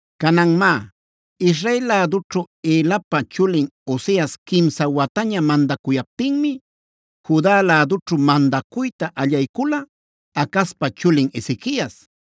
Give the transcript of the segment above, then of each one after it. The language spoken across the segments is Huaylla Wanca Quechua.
Canan má, Israel lädućhu Elapa chulin Oseas quimsa wataña mandacuyaptinmi, Juda lädućhu mandacuyta allaycula Acazpa chulin Ezequias.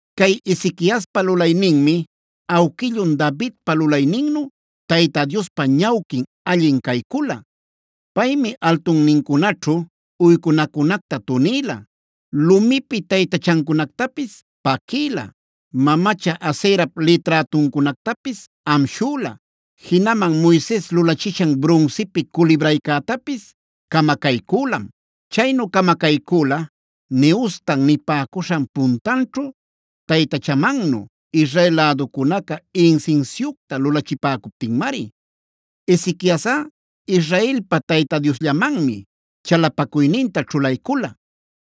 Cay Ezequiaspa lulayninmi awquillun Davidpa lulayninnu Tayta Diospa ñawquin allin caycula. Paymi altunnincunaćhu uycunacunacta tunïla, lumipi taytachancunactapis paquïla, mamacha Aserap liträtuncunactapis amshüla. Jinaman Moises lulachishan brunsipi culibraycätapisb camacaycülam; chaynu camacaycüla Nehustana nipäcuśhan puntanćhu taytachamannu Israel läducunaca insinsiucta lupachipäcuptinmari. Ezequiasꞌa, Israelpa Tayta Diosllamanmi chalapacuyninta ćhulaycula.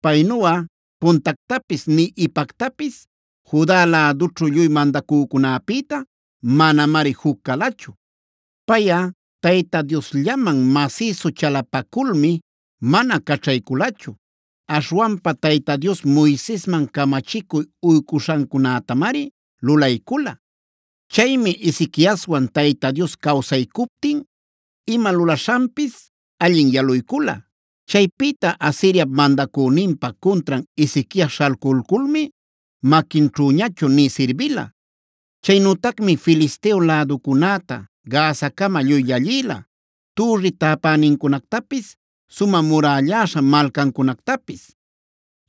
Paynuꞌa puntactapis nï ipactapis Juda lädućhu lluy mandacücunäpïta manamari juc calachu. Payꞌa Tayta Diosllaman masïsu chalapaculmi mana caćhayculachu. Aśhwanpa Tayta Dios Moisesman camachicuy uycuśhancunätamari lulaycula. Chaymi Ezequiaswan Tayta Dios cawsaycuptin ima lulaśhanpis allin yaluycula. Chaypïta Asiriap mandacüninpa cuntran Ezequias śhalculculmi maquinćhüñachu nï sirbila. Chaynütacmi Filisteo läducunäta Gazacama lluy llallïla, türri täpänincunactapis, sumä murällaśha malcancunactapis.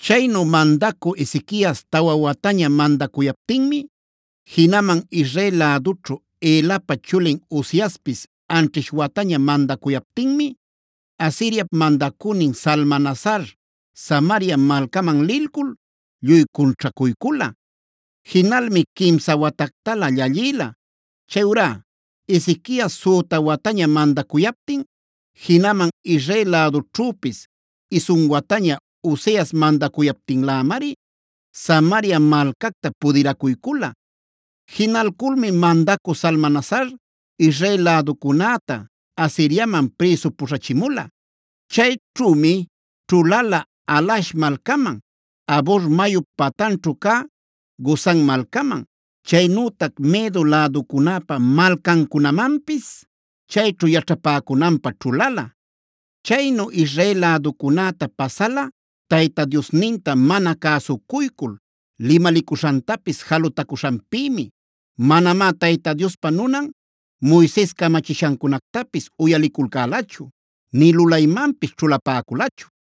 Chaynu mandacü Ezequias tawa wataña mandacuyaptinmi, jinaman Israel lädućhu Elapa chulin Oseaspis anćhish wataña mandacuyaptinmi, Asiriap mandacünin Salmanasar Samaria malcaman lilcul lluy cunćhacuycula. Jinalmi quimsa watactalä llallïla. Chayurá Ezequias süta wataña mandacuyaptin, jinaman Israel lädućhüpis isun wataña Oseas mandacuyaptinlämari Samaria malcacta pudiracuycula. Jinalculmi mandacü Salmanasar, Israel läducunäta Asiriaman prïsu puśhachimula. Chayćhümi ćhulala Halah malcaman, Habor mayup patanćhu cä Gozan malcaman. Chaynütac Medo läducunäpa malcancunamanpis chayćhu yaćhapäcunanpä ćhulala. Chaynu Israel läducunäta pasala Tayta Diosninta mana cäsucuycul limalicuśhantapis jalutacuśhanpïmi. Manamá Tayta Diospa nunan Moises camachishancunactapis uyaliculcälachu nï lulaymanpis ćhulapäculachu.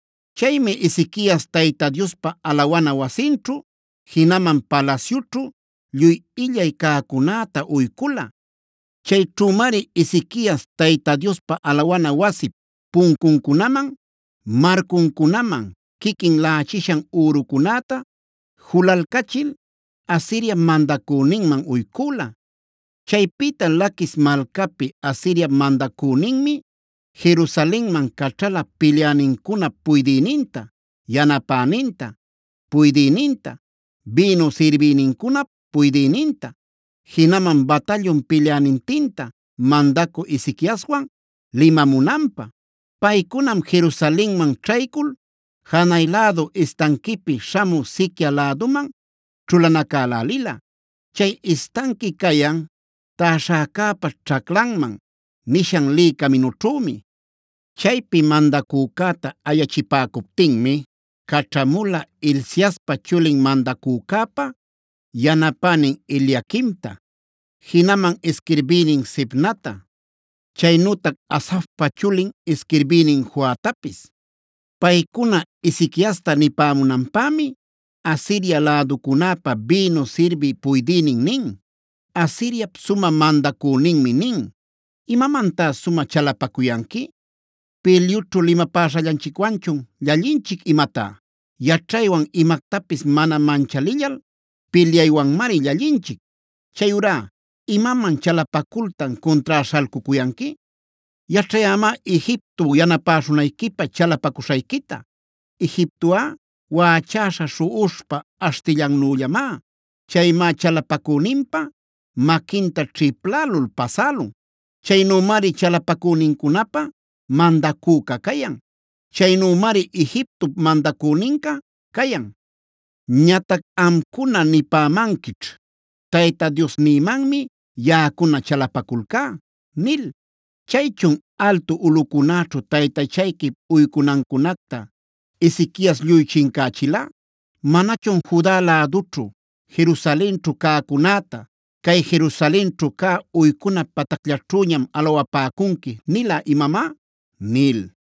Chaymi Ezequias Tayta Diospa alawana wasinćhu, jinaman palasyućhu lluy illay cäcunäta uycula. Chayćhümari Ezequias Tayta Diospa alawana wasip puncuncunaman, marcuncunaman quiquin laꞌachishan ürucunäta julalcachil Asiriap mandacüninman uycüla. Chaypïta Laquis malcapi Asiriap mandacüninmi, Jerusalenman caćhala pilyänincunap puydïninta, yanapäninpa puydïninta, bïnu sirbïnincunap puydïninta, jinaman batallun pilyänintinta mandacü Ezequiaswan limamunanpä. Paycunam Jerusalenman ćhaycul janay lädu istanquipi śhamü siquia läduman ćhulanacälälila. Chay istanqui cayan “Täśhäcäpa ćhaclanman” nishan lï caminućhümi. Chaypi mandacücäta ayachipäcuptinmi caćhamula Hilciaspa chulin mandacücäpa yanapänin Eliaquimta, jinaman isquirbïnin Sebnata, chaynütac Asafpa chulin isquirbïnin Joatapis. Paycuna Ezequiasta nipämunanpämi, Asiria läducunäpa bïnu sirbï puydïnin nin: “Asiriap sumä mandacüninmi nin: ‘¿¡Imamantá sumä chalapacuyanqui!? ¿¡Pilyućhu limapäśhallanchicwanchun llallinchic imatá!? Yaćhaywan imactapis mana manchalillal pilyaywanmari llallinchic. Chayurá ¿imaman chalapacultan cuntrá śhalcucuyanqui? Yaćhayämá Egipto yanapäśhunayquipä chalapacuśhayquita. Egiptoꞌa waꞌachäśha śhuꞌuśhpa aśhtillannüllamá; chaymá chalapacüninpa maquinta ćhiplälul pasälun. Chaynümari chalapacünincunapä mandacüca cayan. Chaynümari Egiptop mandacüninca cayan. “ ‘Ñatac amcuna nipämanquićh: “Tayta Diosnïmanmi yaꞌacuna chalapaculcá” nil. Chaychun ¿altu ulꞌucunäćhu taytachayquip uycunancunacta Ezequias lluy chincächila? ¿¡Manachun Juda lädućhu, Jerusalenćhu cäcunäta cay Jerusalenćhu cä uycuna patacllaćhüñam alawapäcunqui nila imamá!?’ nil.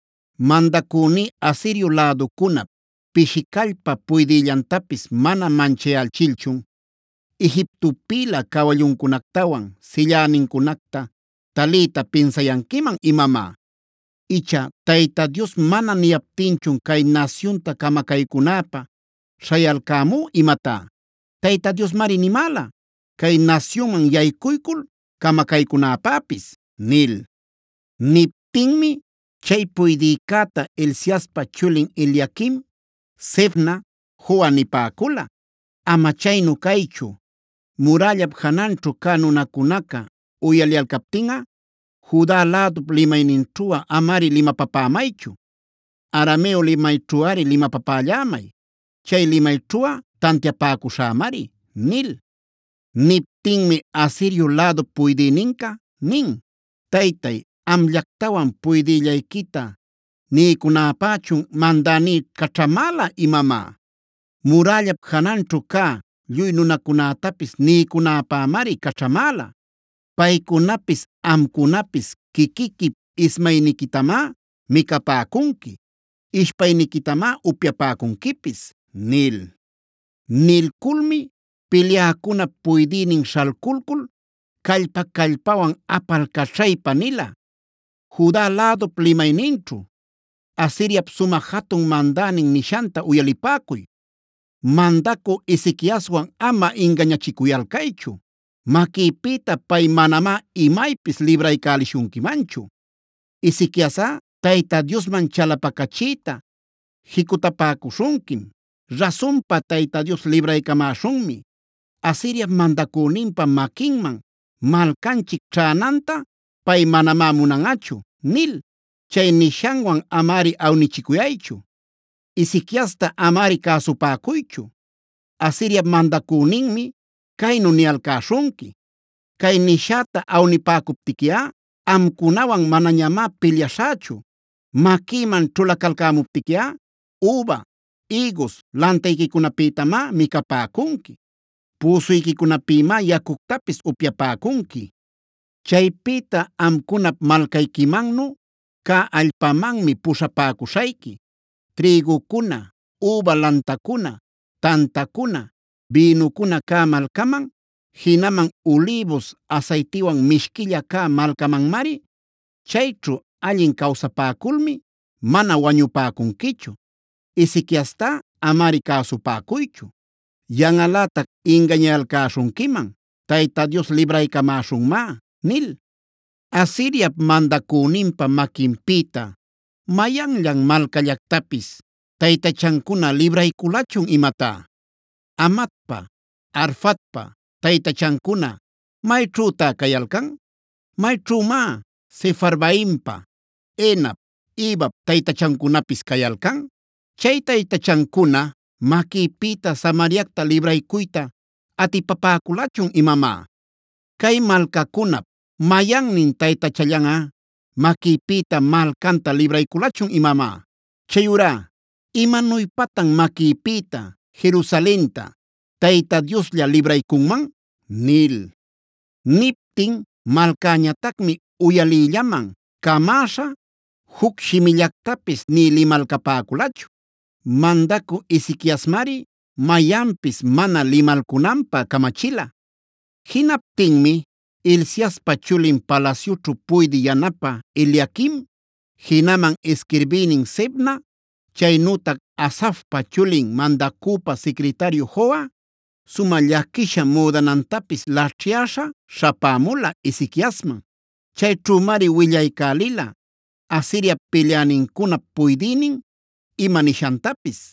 Mandacüní Asirio läducunap pishi callpa puydïllantapis mana manchayächilchun, ¿Egiptopïlä cawallucunactawan sillänincunacta taliyta pinsayanquiman imamá? Icha ¿Tayta Dios mana niycamaptinchun cay nasyunta camacaycunäpä śhayalcämú imatá? Tayta Diosmari nimäla, cay nasyunman yaycuycul camacaycünäpäpis” nil. Niptinmi chay puydïcäta Hilciaspa chulin Eliaquim, Sebna, Joa nipäcula: “Ama chaynu caychu, murällap jananćhu cä nunacunaca uyaliyalcaptinꞌa, Juda lädup limayninćhuꞌa amari limapapämaychu. Arameo limayćhuꞌari limapapällämay; chay limayćhuꞌa tantiapäcuśhämari” nil. Niptinmi Asirio lädup puydïninca nin: “¿Taytay, amllactawan puydïllayquita niycunäpächun mandäní caćhamäla imamá? Murällap jananćhu cä lluy nunacunätapis niycunäpämari caćhamäla. Paycunapis amcunapis quiquiquip ismayniquitamá micapäcunqui; ishpayniquitamá upyapäcunquipis” nil. Nilculmi pilyäcunap puydïnin śhalculcul, callpa-callpawan apalcaćhaypa nila, Juda lädup limayninćhu: “Asiriap sumä jatun mandänin nishanta uyalipäcuy: ‘Mandacü Ezequiaswan ama ingañachicuyalcaychu; maquïpïta pay manamá imaypis libraycälishunquimanchu. Ezequiasꞌa Tayta Diosman chalapacachiyta jicutapäcuśhunquim: “Rasunpa Tayta Dios libraycamäśhunmi. Asiriap mandacüninpa maquinman, malcanchic ćhänanta pay manamá munanꞌachu” nil. Chay nishanwan amari awnichicuyaychu. Ezequiasta amari cäsupäcuychu. Asiriap mandacüninmi caynu niyalcäśhunqui: “Cay nishäta awnipäcuptiquiꞌa amcunawan manañamá pilyaśhächu. Maquïman ćhulacalcämuptiquiꞌa üba, ïgus lantayquicunapïtamá micapäcunqui; püsuyquicunapïmá yacuctapis upyapäcunqui. Chaypïta amcunap malcayquimannu cä allpamanmi puśhapäcuśhayqui: trïgucuna, üba lantacuna, tantacuna, bïnucuna cä malcaman, jinaman ulïbus asaytiwan mishquilla cä malcamanmari. Chayćhu allin cawsapäculmi mana wañupäcunquichu. Ezequiastá amari cäsupäcuychu. Yanꞌalätac ingañayalcäśhunquiman Tayta Dios libraycamäśhunmá nil. ¿¡Asiriap mandacüninpa maquinpïta mayanllan malcallactapis taytachancuna librayculachun imatá!? ¿Hamatpa, Arfadpa taytachancuna mayćhütá cayalcan? ¿Mayćhümá Sefarvaimpa, Henap, Ivap taytachancunapis cayalcan? ¿Chay taytachancuna maquïpïta Samariacta libraycuyta atipapäculachun imamá? ¿Cay malcacunap mayannin taytachallanꞌa maquïpïta malcanta librayculachun imamá? Chayurá ¿imanuypatan maquïpïta Jerusalenta Tayta Dioslla libraycunman?”’” nil. Niptin malcäñatacmi uyaliyllaman camäśha juc shimillactapis nï limalcapäculachu. Mandacü Ezequiasmari mayanpis mana limalcunanpä camachila. Jinaptinmi Hilciaspa chulin palasyućhu puydï yanapä Eliaquim, jinaman isquirbïnin Sebna, chaynütac Asafpa chulin mandacüpa sicritariu Joa, sumä llaquisha müdanantapis laćhyäśha śhapämula Ezequiasman. Chayćhümari willaycälila Asiriap pilyänincunap puydïnin ima nishantapis.